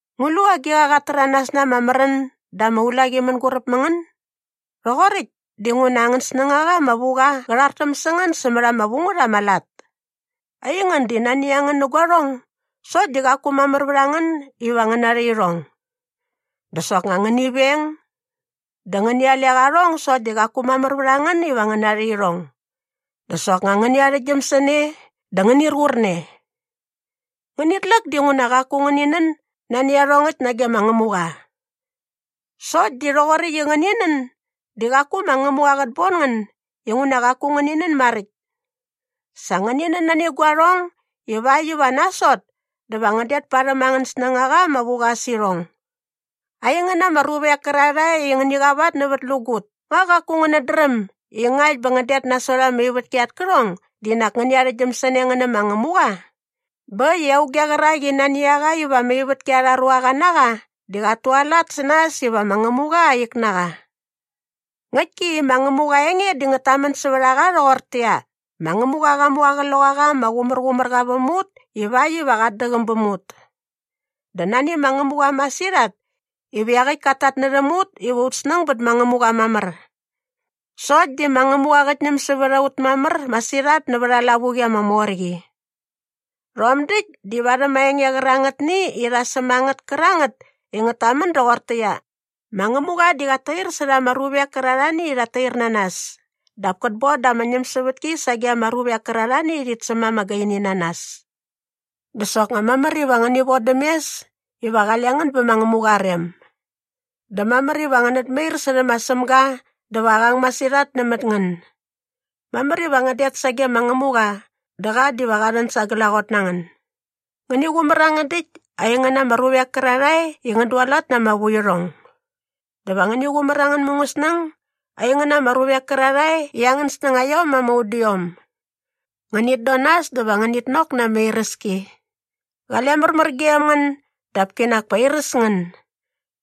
Ngu lu agiqa qat täranas na ama märän dä ama ulaqi mänguräp mä ngän? Rhoqoräkt dinguna angän snängaqa ama vu qa qä rhartäm sä ngän sämät ama vu ngät ama lat. Aingän di nani a ngän nä guarhong sokt di qaku mamär vät a ngän iva ngän narha irhong. Dä soknga ngäni veng. Dä ngäni alek arhong sokt di qaku mamär vät a ngän iva ngän narha irhong. Dä soknga ngäni arhäktgyäm sä ne dä ngänir qur ne. Ngänit läk dinguna qaku ngäni nän nani iarhongäkt nage ma Ngämuqa. Sokt di rhoqoräkt i ngäni nän di qaku ma Ngämuqa qät bon ngän inguna qaku ngäni nän maräkt. Sa ngäni nän nani guarhong ivakt iva nasot dä va ngän det parhäm angän snängaqa ama vu qa sä irhong. Aingän ama ruvek kärarhae i ngäni qavatnävätlägut, nga qaku ngänät dräm i ngakt bä ngän det nasot ama ivätki at kärhong di nak ngäni arhäktgyäm sä ne ngän nä ma Ngämuqa? Bä äkt i auge qärak i nani a qa iva ama ivätki arha ruaqa na qa di qat tualat sä nas iva ma Ngämuqa aa ik na qa. Ngäktki i Ngämuqa aa enge di ngät tamän sävät a qa rhoqortäqyia, “Ma Ngämuqa qa mu ama Qloqaqa ama Qumärqumärqa väm ut ivakt iva qat däqäm bäm ut. Dä nani ma Ngämuqa masirhat iva iaqäkt kat tatnärhäm ut iva ut snäng bät ma Ngämuqa mamär.” Sokt di ma Ngämuqa qät ñäm sävät a ut mamär masirhat nävät aa lavuqi ama mor qi. Rhom däkt di varhäm aa enge qärangätni i rha säm a ngät kärangät i ngät tamän doqortäqyia, “Ma Ngämuqa di qat tair särha ama ruvek kärarhani i rhat tair na nas dap kät bon da ama ñämsävätki sage ama ruvek kärarhani i rhit säm ama gaini na nas.” Dä soknga mamär iva ngäni vodäm mes iva qale ngän bä ma Ngämuqa aa rem. Dä mamär iva ngänät mair särhä ma Sämga dä va qa ang masirhat nämät ngän. Mamär iva ngän det sage ma Ngämuqa dä qa diva qa rhän sa glaqot na ngän. Ngäni qumär angän däkt, aingän ama ruvek kärarhae i ngän dualat na ama vuirhong. Dä va ngäni qumär angän mungäsnäng, aingän ama ruvek kärarhae i angän snängaiom ama udiom. Ngänit don nas dä va ngänit nok na ama iräski. Qale märmär gem ngän dap kinak pa airäs ngän.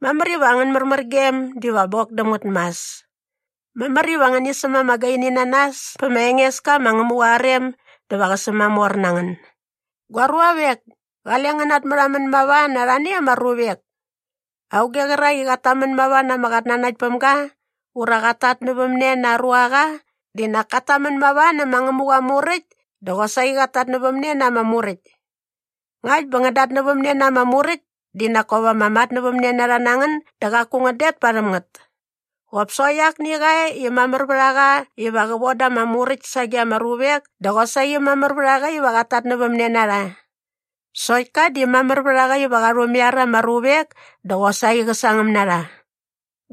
Mamär iva angän märmärgem diva bok däm ngät mas. Mamär iva ngäni säm ama gaini na nas pä ma Engeska ma Ngämuqa aa rem dä va qä sämamor na ngän. Gua ruavek, kale ngän natmärhamän mava na arhani ama ruvek. Auge qärak i qat tamän mava na ama qatnanaktpämga ura qat tatnävämne na aa ruaqa di nak kat tamän mava nä ma Ngämuqa aa Muräkt dä qosaqi qat tatnävämne na ama Muräkt. Ngakt bä ngän datnävämne na ama Muräkt di nak kop ama matnävämnenarha na ngän dä qaku ngän det parhäm ngät. Qop sokt akni qa e i mamär vät a qa iva qä von da ama muräkt sage ama ruvek dä qosaqi mamär vät a qa iva qat tatnävämne na rha. Sokt ka di mamär vät a qa iva qa rhumaiar ama ruvek dä qosaqi qä sangäm na rha.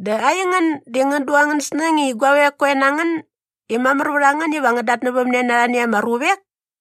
Dä aingän di ngän du angän snäng i guavek koe na ngän i mamär vät a ngän iva ngän datnävämne na arhani ama ruvek?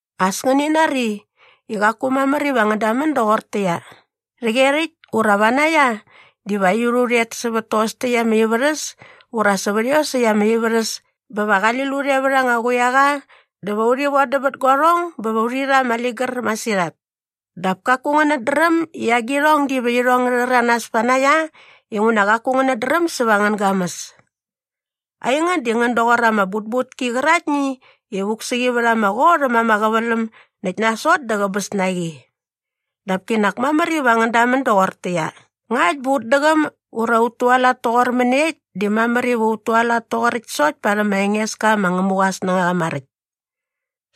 As ngäni nari i qaku mamär iva ngän damän doqortäqyia, “Rhäqyerhäkt ura vanaia diva aiut u rhet bä sävät tos täkt ama ivärhäs ura sävät iosäkt ama ivärhäs bä va qali lut e vät anga quiaqa dä va urhi vodäm bät guarhong bä va urhi rha ama ligär masirhat” dap kaku ngänät dräm i agirhong diva irhong ngä rhäranas panaia inguna qaku ngänät dräm säva angän gamäs. Aingän di ngän doqor ama butbutki qäraktni i vuk sä qi vät ama qot äm ama qäväläm näkt nasot dä qäbäs na qi. Dap kinak mamär iva ngän damän doqortäqyia, “Ngakt bä ut däqäm ura ut tualat toqor mäniekt di mamär iva ut tualat toqoräkt sokt parhäm ma Engeska ma Ngämuqa aa snängaqa maräkt.”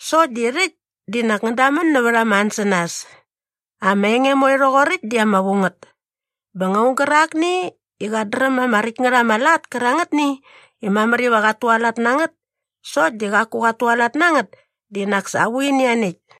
Sokt di rhäkt di nak ngän dämän nävät ama ansänas. Ama enge moe rhoqoräkt di ama vu ngät. Bä nga aung gärakni i qat dräm ama räkt ngät ama lat kärangätni i mamär iva qat tualat na ngät sokt di qaku qat tualat na ngät di nak sa aa vuini ianiäkt.